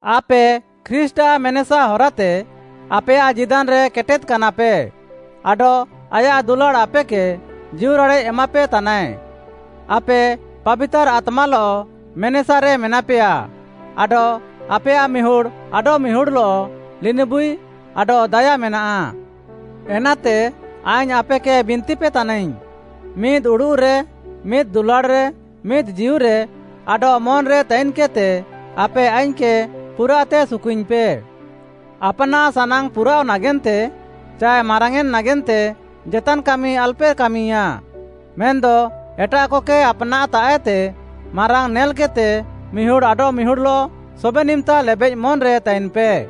ଆପେ ଖ୍ରୀଷ୍ଟ୍‌ଆଃ ମେନେସା ହରାତେ ଆପେୟାଃ ଜୀଦାନ୍‌ରେ କେଟେଦ୍‌କାନାପେ, ଆଡଃ ଆୟାଃ ଦୁଲାଡ଼୍‌ ଆପେକେ ଜୀଉରାଡ଼େଃ ଏମାପେତାନାଏ। ଆପେ ପାବିତାର୍‌ ଆତ୍ମାଲଃ ମେନେସାରେ ମେନାପେୟା ଆଡଃ ଆପେୟାଃ ମିହୁଡ଼୍‌ ଆଡଃମିହୁଡ଼୍‌ଲଃ ଲିନିବୁଇ ଆଡଃ ଦାୟା ମେନାଃ। ଏନାତେ ଆଇଙ୍ଗ୍‌ ଆପେକେ ବିନ୍ତିପେ ତାନାଇଙ୍ଗ୍‌, ମିଦ୍‌ ଉଡ଼ୁଃରେ, ମିଦ୍‌ ଦୁଲାଡ଼୍‌ରେ, ମିଦ୍‌ ଜୀଉରେ ଆଡଃ ମନ୍‌ରେ ତାଇନ୍‌କେଦ୍‌ତେ ଆପେ ଆଇଙ୍ଗ୍‌କେ ପୁରାଃତେ ସୁକୁଇଙ୍ଗ୍‌ପେ। ଆପ୍‌ନାଃ ସାନାଙ୍ଗ୍‌ ପୁରାଅଃ ନାଗେନ୍ତେ ଚାଏ ମାରାଙ୍ଗ୍‌ୟେଁନ୍‌ ନାଗେନ୍ତେ ଜେତାନ୍‌ କାମି ଆଲପେ କାମିୟାଁ। ମେନ୍‌ଦ ଏଟାଃକକେ ଆପାନ୍‌ତାଃଏତେ ମାରାଙ୍ଗ୍‌ ନେଲ୍‌କେଦ୍‌ତେ, ମିହୁଡ଼୍‌ ଆଡଃମିହୁଡ଼୍‌ଲଃ ସବେନ୍‌ ଇମ୍‌ତା ଲେବେଃ ମନ୍‌ରେ ତାଇନ୍‌ପେ।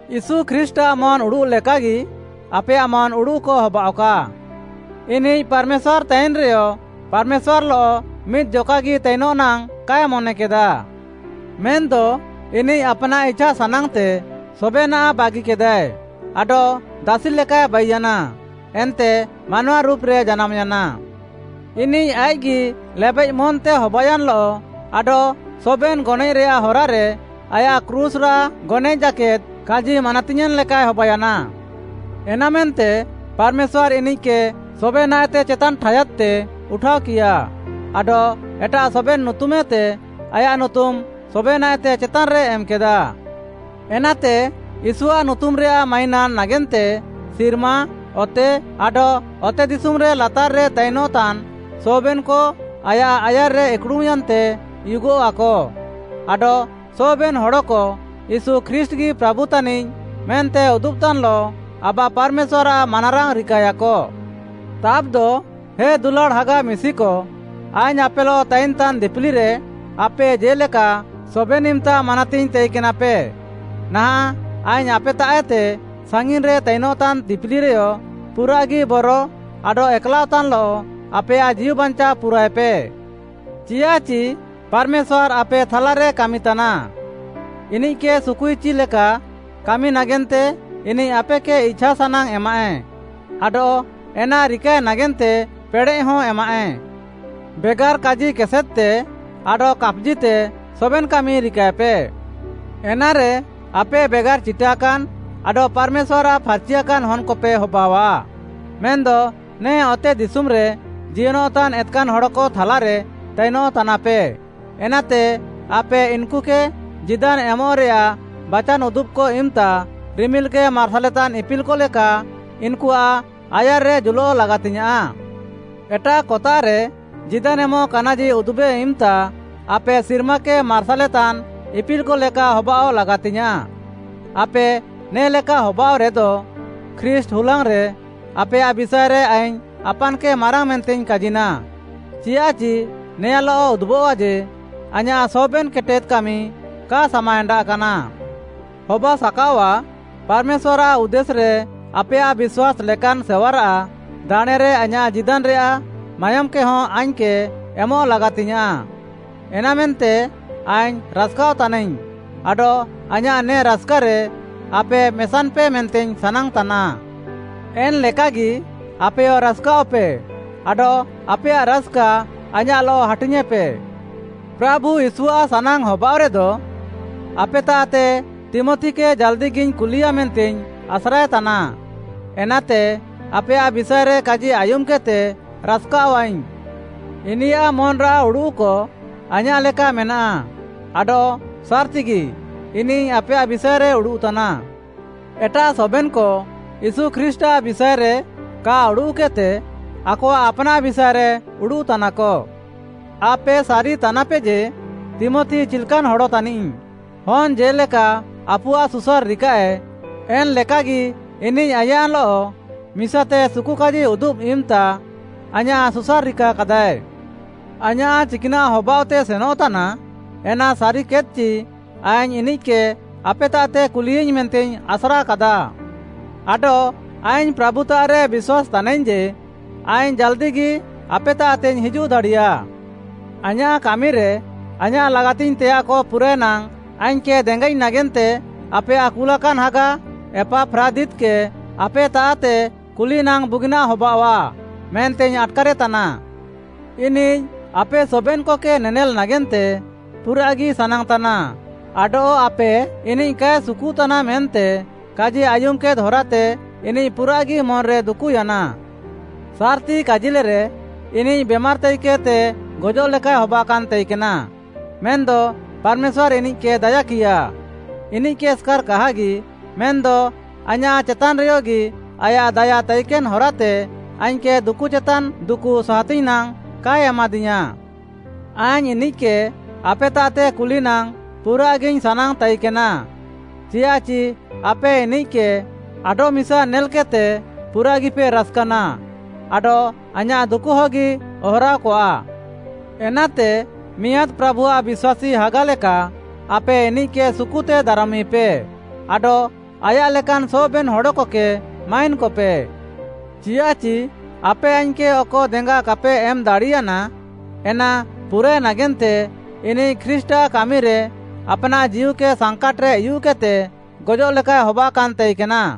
ୟୀଶୁ ଖ୍ରୀଷ୍ଟ୍‌ଆଃ ମନ୍‌ ଉଡ଼ୁଃ ଲେକାଗି ଆପେୟାଃ ମନ୍‌ ଉଡ଼ୁଃକ ହବାଅଃକା। ଇନିଃ ପାର୍‌ମେଶ୍ୱାର୍‌ ତାଇନ୍‌ରେୟ, ପାର୍‌ମେଶ୍ୱାର୍‌ଲଃ ମିଦ୍‌ ଜକାଗି ତାଇନଃ ନାଙ୍ଗ୍‌ କାଏ ମନେକେଦା। ମେନ୍‌ଦ ଇନିଃ ଆପ୍‌ନାଃ ଇଛାସାନାଙ୍ଗ୍‌ତେ ସବେନାଃ ବାଗିକେଦାଏ, ଆଡଃ ଦାସି ଲେକାଏ ବାଇୟାନା ଏନ୍ତେ ମାନୱା ରୁପ୍‌ରେ ଜାନାମ୍‌ୟାନା। ଇନିଃ ଆଇଃକ୍‌ଗି ଲେବେଃ ମନ୍‌ତେ ହବାୟାନ୍‌ଲଃ ଆଡଃ ସବେନ୍‌ ଗନଏଃରେୟାଃ ହରାରେ ଆୟାଃ କ୍ରୁଶ୍‌ରାଃ ଗନଏଃ ଜାକେଦ୍‌ କାଜି ମାନାତିୟେଁନ୍‌ ଲେକାଏ ହବାୟାନା। ଏନାମେନ୍ତେ ପାର୍‌ମେଶ୍ୱାର୍‌ ଇନିଃକେ ସବେନାଃଏତେ ଚେତାନ୍‌ ଠାୟାଦ୍‌ତେ ଉଠାଅକିୟା, ଆଡଃ ଏଟାଃ ସବେନ୍‌ ନୁତୁମ୍‌ଏତେ ଆୟାଃ ନୁତୁମ୍‌ ସବେନାଃଏତେ ଚେତାନ୍‌ରେ ଏମ୍‌କେଦା। ଏନାତେ ୟୀଶୁଆଃ ନୁତୁମ୍‌ରେୟାଃ ମାଇନାନ୍‌ ନାଗେନ୍ତେ ସିର୍ମା, ଅତେ, ଆଡଃ ଅତେଦିଶୁମ୍‌ରେ ଲାତାର୍‌ରେ ତାଇନ୍‌ତାନ୍‌ ସବେନ୍‌କ ଆୟାଃ ଆୟାର୍‌ରେ ଇକ୍‌ଡ଼ୁମ୍‌ୟାନ୍ତେ ଉୟୁଗଃଆକ, ଆଡଃ ସବେନ୍‌ ହଡ଼କ ୟୀଶୁ ଖ୍ରୀଷ୍ଟ୍‌ଗି ପ୍ରାଭୁ ତାନିଃ ମେନ୍ତେ ଉଦୁବ୍‌ତାନ୍‌ଲଃ ଆବା ପାର୍‌ମେଶ୍ୱାର୍‌ଆଃ ମାନାରାଙ୍ଗ୍‌ ରିକାୟାକ। ତାବ୍‌ଦ ହେ ଦୁଲାଡ଼୍‌ ହାଗା ମିଶିକ, ଆଇଙ୍ଗ୍‌ ଆପେଲଃ ତାଇନ୍‌ତାନ୍‌ ଦିପିଲିରେ ଆପେ ଜେ'ଲେକା ସବେନ୍‌ ଇମ୍‌ତା ମାନାତିଙ୍ଗ୍‌ ତାଇକେନାପେ, ନାହାଁଃ ଆଇଙ୍ଗ୍‌ ଆପେତାଃଏତେ ସାଙ୍ଗିନ୍‌ରେ ତାଇନଃତାନ୍‌ ଦିପିଲିରେୟ ପୁରାଃଗି ବର ଆଡଃ ଏକ୍‌ଲାଅଃତାନ୍‌ଲଃ ଆପେୟାଃ ଜୀଉବାଞ୍ଚାଅ ପୁରାଏପେ। ଚିଆଃଚି ପାର୍‌ମେଶ୍ୱାର୍‌ ଆପେ ଥାଲାରେ କାମିତାନା। ଇନିଃକେ ସୁକୁଇଚି ଲେକା କାମି ନାଗେନ୍ତେ ଇନିଃ ଆପେକେ ଇଛାସାନାଙ୍ଗ୍‌ ଏମାଃଏ ଆଡଃ ଏନା ରିକାଏ ନାଗେନ୍ତେ ପେଡ଼େଃହଁ ଏମାଃଏ। ବେଗାର୍‌ କାଜି କେସେଦ୍‌ତେ ଆଡଃ କାପ୍‌ଜିତେ ସବେନ୍‌ କାମି ରିକାଏପେ। ଏନାରେ, ଆପେ ବେଗାର୍‌ ଚିଟାକାନ୍‌ ଆଡଃ ପାର୍‌ମେଶ୍ୱାର୍‌ଆଃ ଫାର୍‌ଚିଆକାନ୍‌ ହନ୍‌କପେ ହବାଅଃଆ। ମେନ୍‌ଦ ନେ ଅତେଦିଶୁମ୍‌ରେ ଜିୟନଃତାନ୍‌ ଏତ୍‌କାନ୍‌ ହଡ଼କ ଥାଲାରେ ତାଇନଃତାନାପେ, ଏନାତେ ଆପେ ଇନ୍‌କୁକେ ଜୀଦାନ୍‌ ଏମଃରେୟାଃ ବାଚାନ୍‌ ଉଦୁବ୍‌କ ଇମ୍‌ତା ରିମିଲ୍‌କେ ମାର୍ସାଲେତାନ୍‌ ଇପିଲ୍‌କ ଲେକା ଇନ୍‌କୁଆଃ ଆୟାର୍‌ରେ ଜୁଲଃ ଲାଗାତିଙ୍ଗ୍‌ୟାଁଃ। ଏଟାଃକତାଃରେ ଜୀଦାନ୍‌ ଏମଃ କାନାଜି ଉଦୁବେ ଇମ୍‌ତା, ଆପେ ସିର୍ମାକେ ମାର୍ସାଲେତାନ୍‌ ଇପିଲ୍‌କ ଲେକା ହବାଅଃ ଲାଗାତିୟାଁ। ଆପେ ନେ'ଲେକା ହବାଅଃରେଦ, ଖ୍ରୀଷ୍ଟ୍‌ ହୁଲାଙ୍ଗ୍‌ରେ ଆପେୟାଃ ବିଷାଏରେ ଆଇଙ୍ଗ୍‌ ଆପାନ୍‌କେ ମାରାଙ୍ଗ୍‌ ମେନ୍ତେଇଙ୍ଗ୍‌ କାଜିନା, ଚିଆଃଚି ନେଆଁଲଃ ଉଦୁବଃଆ ଯେ, ଆଇଁୟାଃ ସବେନ୍‌ କେଟେଦ୍‌ କାମି କା ସାମାଏଣ୍ଡାଃ କାନା। ହବାସାକାଅଆଃ ପାର୍‌ମେଶ୍ୱାର୍‌ଆଃ ଉଦ୍ଦେଶ୍‌ରେ ଆପେୟାଃ ବିଶ୍ୱାସ୍‌ ଲେକାନ୍‌ ସେୱାରାଃ ଦାଣେଁରେ ଆଇଁୟାଃ ଜୀଦାନ୍‌ରେୟାଃ ମାୟୋମ୍‌କେ ହଁ ଆଇଙ୍ଗ୍‌କେ ଏମଃ ଲାଗାତିଙ୍ଗ୍‌ୟାଁଃ। ଏନାମେନ୍ତେ ଆଇଙ୍ଗ୍‌ ରାସ୍‌କାଅଃତାନାଇଙ୍ଗ୍‌ ଆଡଃ ଆଇଁୟାଃ ନେ ରାସ୍‌କାରେ ଆପେ ମେସାନ୍‌ପେ ମେନ୍ତେଇଙ୍ଗ୍‌ ସାନାଙ୍ଗ୍‌ତାନା। ଏନ୍‌ ଲେକାଗି, ଆପେୟ ରାସ୍‌କାଅଃପେ ଆଡଃ ଆପେୟାଃ ରାସ୍‌କା ଆଇଁୟାଃଲଃ ହାଟିୟେଁପେ। ପ୍ରାଭୁ ୟୀଶୁଆଃ ସାନାଙ୍ଗ୍‌ ହବାଅଃରେଦ, ଆପେତାଃତେ ତୀମଥିକେ ଜାଲ୍‌ଦିଗିଇଙ୍ଗ୍‌ କୁଲିୟା ମେନ୍ତେଇଙ୍ଗ୍‌ ଆସ୍ରାଏତାନା। ଏନାତେ ଆପେୟାଃ ବିଷାଏରେ କାଜି ଆୟୁମ୍‌କେଦ୍‌ତେ ରାସ୍‌କାଅଃଆଇଙ୍ଗ୍‌। ଇନିୟାଃ ମନ୍‌ରାଃ ଉଡ଼ୁଃକ ଆଇଁୟାଃ ଲେକା ମେନାଃ ଆଡଃ ସାର୍‌ତିଗି ଇନିଃ ଆପେୟାଃ ବିଷାଏରେ ଉଡ଼ୁଃତାନା। ଏଟାଃ ସବେନ୍‌କ ୟୀଶୁ ଖ୍ରୀଷ୍ଟ୍‌ଆଃ ବିଷାଏରେ କା ଉଡ଼ୁଃକେଦ୍‌ତେ ଆକଆଃ ଆପ୍‌ନାଃ ବିଷାଏରେ ଉଡ଼ୁଃତାନାକ। ଆପେ ସାରିତାନାପେ ଯେ ତୀମଥି ଚିଲ୍‌କାନ୍‌ ହଡ଼ ତାନିଃ। ହନ୍‌ ଜେ'ଲେକା ଆପୁଆଃ ସୁସାର୍‌ ରିକାଃଏ, ଏନ୍‌ଲେକାଗି ଇନିଃ ଆଇଁୟାଃଲଃ ମିସାତେ ସୁକୁକାଜି ଉଦୁବ୍‌ ଇମ୍‌ତା ଆଇଁୟାଃ ସୁସାର୍‌ ରିକାକାଦାଏ। ଆଇଁୟାଃ ଚିକ୍‌ନାଃ ହବାଅଃତେ ସେନଃତାନା, ଏନା ସାରିକେଦ୍‌ଚି ଆଇଙ୍ଗ୍‌ ଇନିଃକେ ଆପେତାଃତେ କୁଲିୟାଇଙ୍ଗ୍‌ ମେନ୍ତେଇଙ୍ଗ୍‌ ଆସ୍ରାକାଦା। ଆଡଃ ଆଇଙ୍ଗ୍‌ ପ୍ରାଭୁତାଃରେ ବିଶ୍ୱାସ୍‌ତାନାଇଙ୍ଗ୍‌ ଯେ, ଆଇଙ୍ଗ୍‌ ଜାଲ୍‌ଦିଗି ଆପେତାଃତେଇଙ୍ଗ୍‌ ହିଜୁଃ ଦାଡ଼ିୟା। ଆଇଁୟାଃ କାମିରେ, ଆଇଁୟାଃ ଲାଗାତିଙ୍ଗ୍‌ତେୟାଃକ ପୁରାଏ ନାଙ୍ଗ୍‌ ଆଇଙ୍ଗ୍‌କେ ଦେଙ୍ଗାଇଙ୍ଗ୍‌ ନାଗେନ୍ତେ ଆପେୟାଃ କୁଲାକାନ୍‌ ହାଗା ଏପାଫ୍ରାଦିତ୍‌କେ ଆପେତାଃତେ କୁଲି ନାଙ୍ଗ୍‌ ବୁଗିନାଃ ହବାଅଃଆ ମେନ୍ତେଇଙ୍ଗ୍‌ ଆଟ୍‌କାରେତାନା। ଇନିଃ ଆପେ ସବେନ୍‌କକେ ନେନେଲ୍‌ ନାଗେନ୍ତେ ପୁରାଃଗି ସାନାଙ୍ଗ୍‌ତାନା ଆଡଃ ଆପେ, ଇନିଃ କାଏ ସୁକୁତାନା ମେନ୍ତେ କାଜି ଆୟୁମ୍‌କେଦ୍‌ ହରାତେ ଇନିଃ ପୁରାଃଗି ମନ୍‌ରେ ଦୁକୁୟାନା। ସାର୍‌ତି କାଜିଲେରେ, ଇନିଃ ବେମାର୍‌ ତାଇକେଦ୍‌ତେ ଗଜଃଲେକାଏ ହବାକାନ୍‌ ତାଇକେନା। ମେନ୍‌ଦ ପାର୍‌ମେଶ୍ୱାର୍‌ ଇନିଃକେ ଦାୟାକିୟା। ଇନିଃକେ ଏସ୍‌କାର୍‌ କାହାଗି, ମେନ୍‌ଦ ଆଇଁୟାଃ ଚେତାନ୍‌ରେୟଗି ଆୟାଃ ଦାୟା ତାଇକେନ୍‌ ହରାତେ ଆଇଙ୍ଗ୍‌କେ ଦୁକୁ ଚେତାନ୍‌ ଦୁକୁ ସାହାତିଙ୍ଗ୍‌ ନାଙ୍ଗ୍‌ କାଏ ଏମାଦିୟାଁ। ଆଇଙ୍ଗ୍‌ ଇନିଃକେ ଆପେତାଃତେ କୁଲି ନାଙ୍ଗ୍‌ ପୁରାଃଗିଇଙ୍ଗ୍‌ ସାନାଙ୍ଗ୍‌ ତାଇକେନା, ଚିଆଃଚି ଆପେ ଇନିଃକେ ଆଡଃମିସା ନେଲ୍‌କେଦ୍‌ତେ ପୁରାଃଗିପେ ରାସ୍‌କାନା ଆଡଃ ଆଇଁୟାଃ ଦୁକୁହଗି ଅହରାଅକଆ। ଏନାତେ ମିଆଁଦ୍‌ ପ୍ରାଭୁଆଃ ବିଶ୍ୱାସୀ ହାଗା ଲେକା ଆପେ ଇନିଃକେ ସୁକୁତେ ଦାରମିପେ ଆଡଃ ଆୟାଃ ଲେକାନ୍‌ ସବେନ୍‌ ହଡ଼କକେ ମାଇନ୍‌କପେ। ଚିଆଃଚି ଆପେ ଆଇଙ୍ଗ୍‌କେ ଅକ ଦେଙ୍ଗା କାପେ ଏମ୍‌ ଦାଡ଼ିୟାନା, ଏନା ପୁରାଏ ନାଗେନ୍ତେ ଇନିଃ ଖ୍ରୀଷ୍ଟ୍‌ଆଃ କାମିରେ ଆପ୍‌ନାଃ ଜୀଉକେ ସାଙ୍କାଟ୍‌ରେ ଉୟୁଃକେଦ୍‌ତେ ଗଜଃଲେକାଏ ହବାକାନ୍‌ ତାଇକେନା।